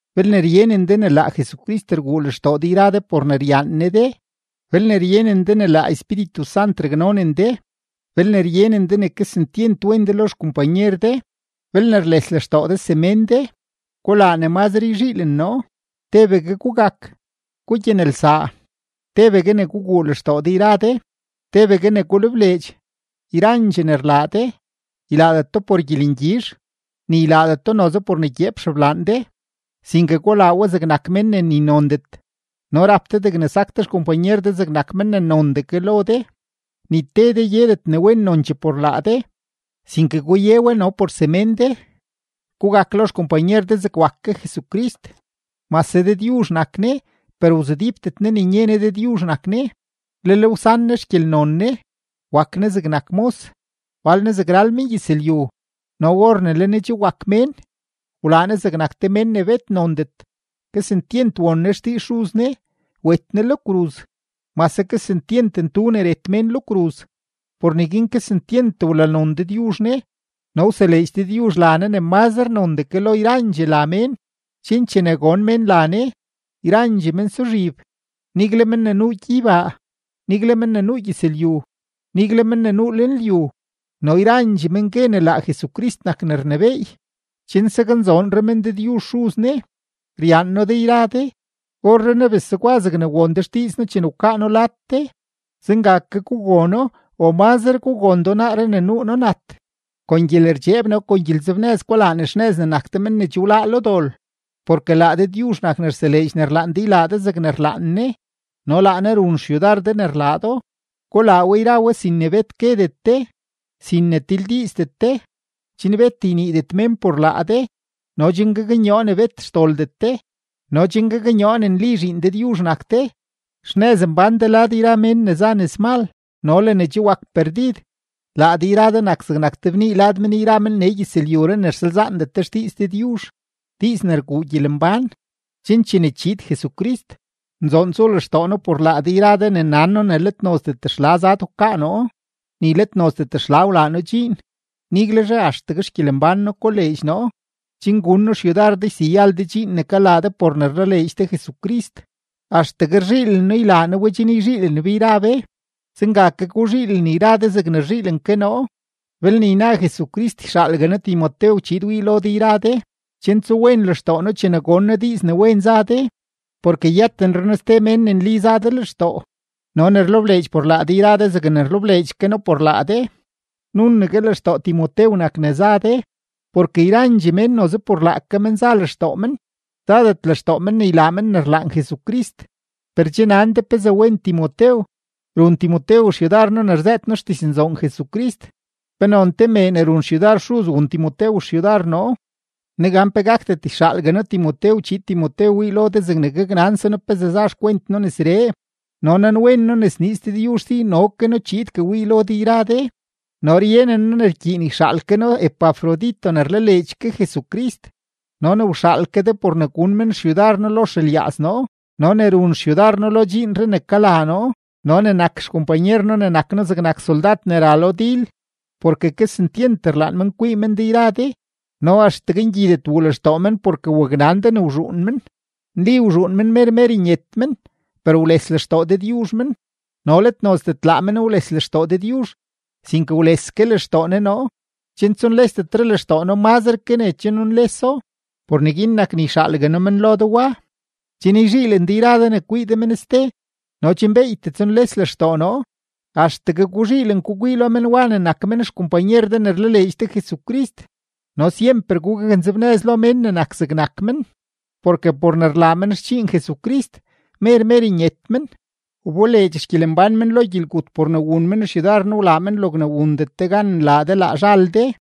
Belne ryenen de ne laa Jesucrist rguu lextoo de yra de por ne ryaan Ne de, belne ryenen de ne laa Espíritu Sant raknonen de, belne ryenen de ne kesentyent wen de lo xkompanyer de, belne rles lextoo de semén de, gulaa ne mazre yzhiilen noo: tebegue gugak, gugyanelsaa, tebegue ne guguu lextoo de yra de, tebegue ne gulebleedx. Yrandxee ne rlaa de, ylaadet do por gyelengyizh, ni ylaadet do noze por ne gyeep xeblaan de, sinke gulaa we zegnak men ne ni nondet, no rap de degne sak de xkompanyer de zegnak men ne nondee ke lo de. Ni te de yedet ne wen nonchee por laa de, sinke guye we no por semén de. Gugak lo xkompanyer de zeg wak ke Jesucrist. Mase Dëdyuzh nak Ne, per wzudípdet Ne ne nye ne Dëdyuzh nak Ne, lel wsan Ne xgyelnon Ne; wak Ne zegnak mos, wal Ne zeg ral mengyëzlyu. No or ne le Ne che wak mén, wlaa Ne zegnak te mén ne bet nondet, kesentyent won Ne xdiiz Xuz Ne, wet Ne lo kruz, mase kesentyent ntu ne ret mén lo kruz. Por neguin kesentyent wlanon Dëdyuzh Ne no wseleedx Dëdyuzh la Ne ne mazre nondee ke lo yrandxee la mén, chen chene gon mén la Ne, yrandxee mén suzhib, nigle men ne nuu gyeybaa, nigle men ne nuu gyëzlyu, nigle men ne nuu lenlyu, no yrandxee men gue ne laa Jesucrist nak ne rnebééy, chen saknzoonre men Dëdyuzh Xuz Ne. Ryaan noo de yra de. Orrenaa bes zegwa zegne won de xdiiz noo chene wkaa noo lad de, zenga ke gugono o mazre gugondoo naaree ne nuu noo nat. Kon gyelerdxeeb no kon gyelenzebnëz gulaa ne xnëz ne nak de men ne che wláá lo dol. Porke laa Dëdyuzh nak ne rseleedx ne rlaan de ylaa de zegne rlaan Ne no laa Ne run xyudar de ne rlaa do. Gulaa we yra we sin ne bet guedet de, sin ne tildiizdet de, chen bet yniidet mén por laa de no chen gaknyoo ne bet xdoldet de no chen gaknyoo ne nli zhiin Dëdyuzh nak de, xnëz mbán de lad yra mén ne za nëzmal no le ne che wak perdid. Laa de yra de nak zegnak te bnii lad men yra men nee gyëzlyuree ne rsalzaandet de xdiiz Dëdyuzh, diiz ne rguu gyelembán, chen chene chiid Jesucrist, nzoon tsuu lextoo noo por laa de yra de ne nan noo ne let nozdet xla zad wkaa noo, ni let nozdet xla wlaa noo dxiin. Niguelzhe axtegue xgyelembán noo koleedx noo, chen gun noo xyudar de yseyal de dxiin ne kalaa de por ne rlaleedx de Jesucrist, axtegue rzhiilen noo ylaa noo we chen yzhiilen be yra be. Zenga ke guzhiilen yra de zegne rzhiilen ke noo. Belne yna Jesucrist, yxaalgue noo Timotew chiid wii lo de yra de, chen tsuwen lextoo noo chene gon noo diiz ne wen za de. Porke yëtenre noo ste mén ne nli za de lextoo no ne rlebleedx por laa de yra de zegne rlebleedx ke noo por laa de, nunegue lextoo Timotew nak ne za de. Porke yrandxee mén noze por laake men za lextoo men, zadet lextoo men ne ylaa men ne rlaan Jesucrist. Per che nan de pezee wen Timotew, run Timotew xyudar noo ne rzëët noo xdiznzoon Jesucrist. Penon te mee ne run xyudar xuz wun Timotew xyudar noo. Negan pe gakdet yxaalgue noo Timotew chiid Timotew wii lo de zegne gaknanse noo pezee za xkwent noo nesree. No nanwen noo ne sniiz Dëdyuzh si no ke noo chiidgue wii lo de yra de. No ryenen noo ne rkyiin yxaal ke noo Epafrodito ne rlaleedx ke Jesucrist no ne wxaal ke de por ne gun men xyudar noo lo xelyaaz noo no ne run xyudar noo lo dxiinree ne kalaa noo no ne nak xkompanyer noo ne nak noo zegnak soldad ne ra lo dil; porke kesentyent rlaan men kwii men de yra de no axtegue ngyidet wuu lextoo men porke waknan de ne wzhuun men. Nli wzhuun men mer mer nyet men, per wles lextoo Dëdyuzh men, no let nozdet laa men wles lextoo Dëdyuzh, sinke wles ke lextoo Ne noo, chen tsunlesdetre lextoo noo mazre ke ne che nunleso. Por neguin nak ne yxaalgue noo men lo de wa, chen yzhiilen de yra de ne kwii de men ste no chen beeytee tsunles lextoo noo. Axtegue guzhiilen gukwii lo men wa ne nak men xkompanyer de ne rlaleedx de Jesucrist no syemper gugaknzebnëz lo mén ne nak zegnak men, porke por ne rlaa men xdxiin Jesucrist, mer mer nyet men; wboleedx xgyelembán men lo gyelgut por ne wun men xyudar noo wlaa men logne wundet de gan nlaa de laa zhal de.